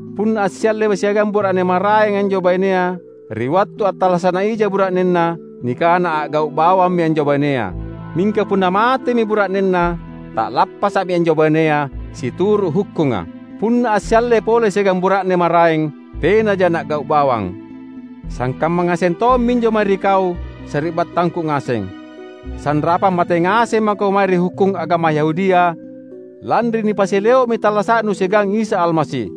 Punna assialle siagang bura’ne maraeng anjo bainea ri wattu attallasa’naija bura’nenna, nikana a’gau’ bawammi anjo bainea. Mingka punna matemi bura’nenna, ta’lappasa’mi anjo bainea, situru’ hukkunga. Punna assialle pole siagang bura’ne maraeng, tenaja na’gau’ bawang. Sangkamma ngaseng tomminjo mae ri kau, sari’battangku ngaseng. Sanrapang mate ngaseng mako mae ri hukkung agama Yahudia lanri nipasileo’mi tallasa’nu siagang Isa Almasi,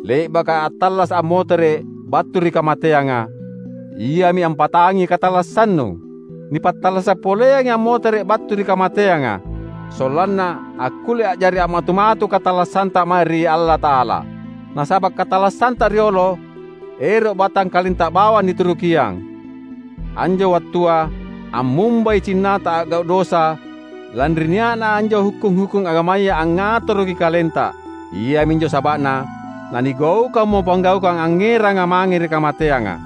le’baka attallasa’ ammotere’ battu ri kamateanga; Iami ampatangi katallassannu. Nipattallasa’ poleangi ammotere’ battu ri kamateanga, sollanna akkulle a’jari a’matu-matu katallassanta mae ri Allata’ala. Nasaba’ katallassanta riolo, ero’ batangkalenta bawang niturukiang. Anjo wattua ammumbai cinnata a’gau’ dosa lanri nia’na anjo hukkung-hukkung agamaya angngatoroki kalenta. Iaminjo saba’na nanigaukammo panggaukang angngeranga mange ri kamateanga.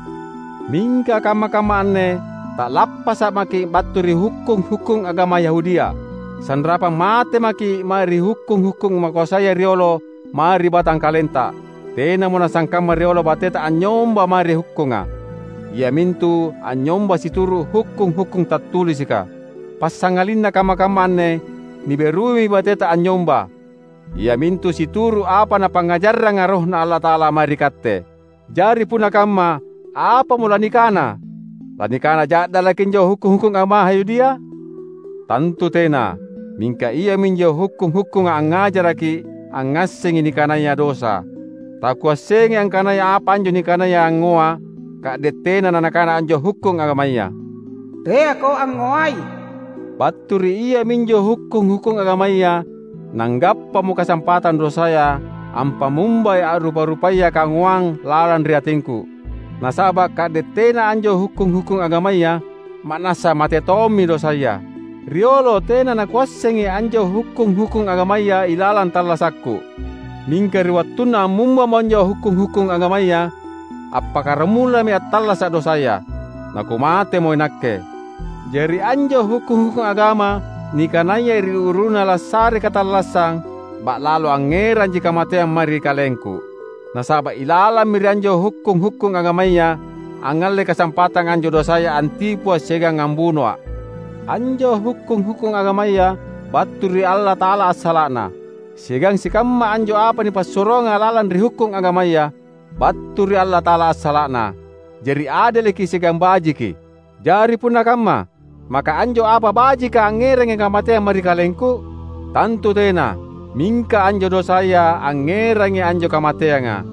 Mingka kamma-kamma anne ta’lappasa’ maki’ battu ri hukkung-hukkung agama Yahudia. Sanrapang mate maki’ mae ri hukkung-hukkung makoasaya riolo mae ri batangkalenta. Tenamo nasangkamma riolo bateta anynyomba mae ri hukkunga, iamintu anynyomba situru’ hukkung-hukkung tattulisika. Passangalinna kamma-kamma anne niberuimi bateta anynyomba, iamintu situru’ apa Napangngajarranga RohNa Allata’ala mae ri katte. Jari punna kamma, apamo lanikana? Lanikana ja’dalaki anjo hukkung-hukkung agama Yahudia? Tantu tena! Mingka iaminjo hukkung-hukkunga angngajarakki’ angngassengi nikanaya dosa. Takuassengai angkana apa anjo nikanaya angngoa, ka’de’ tena nanakana anjo hukkung agamaya, "Teako angngoai." Battu ri iaminjo hukkung-hukkung agamaya nanggappamo kasampatang dosaya ampamumbai a’rupa-rupaya kangoang lalang ri atingku; nasaba’ ka’de’ tena anjo hukkung-hukkung agamaya, ma’nassa mate tommi dosaya. Riolo tena nakuassengi anjo hukkung-hukkung agamaya ilalang tallasakku. Mingka ri wattunna ammumbamo anjo hukkung-hukkung agamaya, appakkaramulami attallasa’ dosaya, nakumatemo inakke. Jari anjo hukkung-hukkung agama nikanaya ri uru-uruna lassare katallassang, ba’lalo angngeranji kamateang mae ri kalengku. Nasaba’ ilalammi ri anjo hukkung-hukkung agamaya angngalle kasampatang anjo dosaya antipua’ siagang ambunoa’. Anjo hukkung-hukkung agamaya battu ri Allata’ala assala’na, siagang sikamma anjo apa nipassuroanga lalang ri hukkung agamaya, battu ri Allata’ala assala’na, jari adeleki siagang bajiki. Jari punna kamma, maka anjo apa bajika angngerangi kamateang mae ri kalengku? Tantu tena! Mingka anjo dosaya angngerangi anjo kamateanga.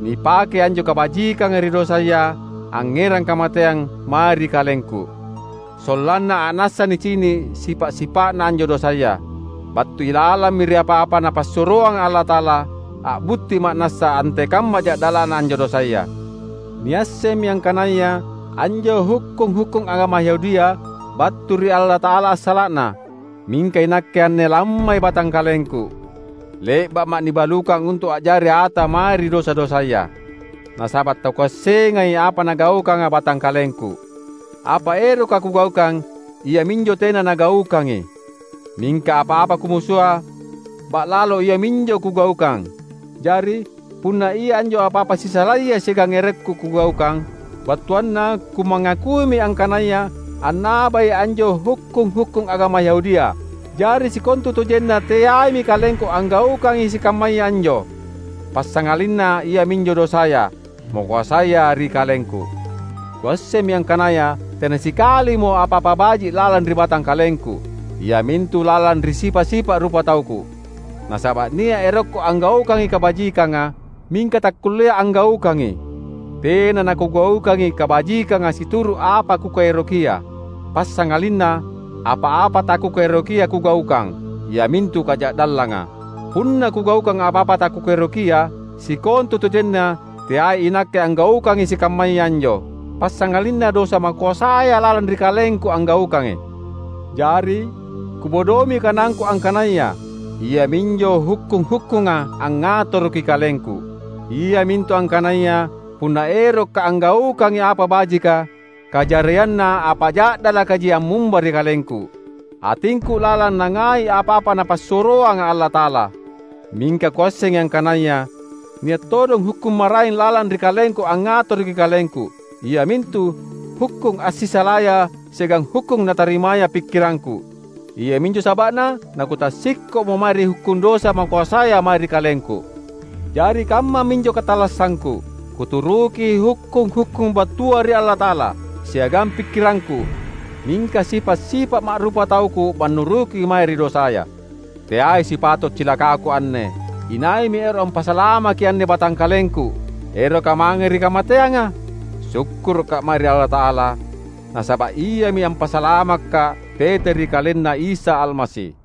Nipakei anjo kabajikanga ri dosaya angngerang kamateang mae ri kalengku, sollanna a’nassa nicini’ sipa’-sipa’na anjo dosaya. Battu ilalammi ri apa-apa Napassuroanga Allata’ala, a’butti ma’nassa antekamma ja’dala’na anjo dosaya. Niassemmi angkanaya anjo hukkung-hukkung agama Yahudia battu ri Allata’ala assala’na; mingka inakke anne lammai batangkalengku. Le’ba’ma’ nibalukang untu’ a’jari ata mae ri dosa-dosaya. Nasaba’ takuassengai apa nagaukanga batangkalengku. Apa eroka kugaukang, iaminjo tena nagaukangi; mingka apa-apa kumusua, ba’lalo iaminjo kugaukang. Jari, punna ia anjo apa-apa sisalaya siagang erokku kugaukang, battuanna kumangakuimi angkanaya annabai anjo hukkung-hukkung agama Yahudia. Jari sikontutojenna teaimi kalengku anggaukangi sikammaya anjo, passangalinna iaminjo dosaya, makoasaya ri kalengku. Kuassemmi angkanaya tena sikalimo apa-apa baji’ lalang ri batangkalengku, iamintu lalang ri sipa’-sipa’ rupatauku. Nasaba’ nia’ erokku anggaukangi kabajikanga, mingka takkullea’ anggaukangi. Tena nakugaukangi kabajikanga situru’ apa kukaerokia; passangalinna apa-apa takukaerokia kugaukang, iamintu kaja’dallanga. Punna kugaukang apa-apa takukaerokia, sikontutojenna teai inakke anggaukangi sikammaya anjo, passangalinna dosa makoasaya lalang ri kalengku anggaukangi. Jari, kubodoimi kanangku angkanaya iaminjo hukkung-hukkunga angngatoroki kalengku: iamintu angkanaya punna erokka’ anggaukangi apa bajika, kajarianna apa ja’dalakaji ammumba ri kalengku. Atingku lalang nangai apa-apa Napassuroanga Allata’ala, mingka kuassengi angkanaya nia’ todong hukkung maraeng lalang ri kalengku angngatoroki kalengku — iamintu hukkung assisalaya siagang hukkung natarimaya pikkirangku. Iaminjo saba’na nakutassikko’mo mae ri hukkung dosa makoasaya mae ri kalengku. Jari kammaminjo katallassangku: kuturuki hukkung-hukkung battua ri Allata’ala, siagang pikkirangku, mingka sipa’-sipa’ ma’rupatauku mannuruki mae ri dosaya. Teai sipato’ cilakaku anne! Inaimi ero’ ampasalamaki anne batangkalengku, eroka mange ri kamateanga? Sukkuruka’ mae ri Allata’ala! Nasaba’ Iami ampasalamakka’ tete ri KalenNa Isa Almasi.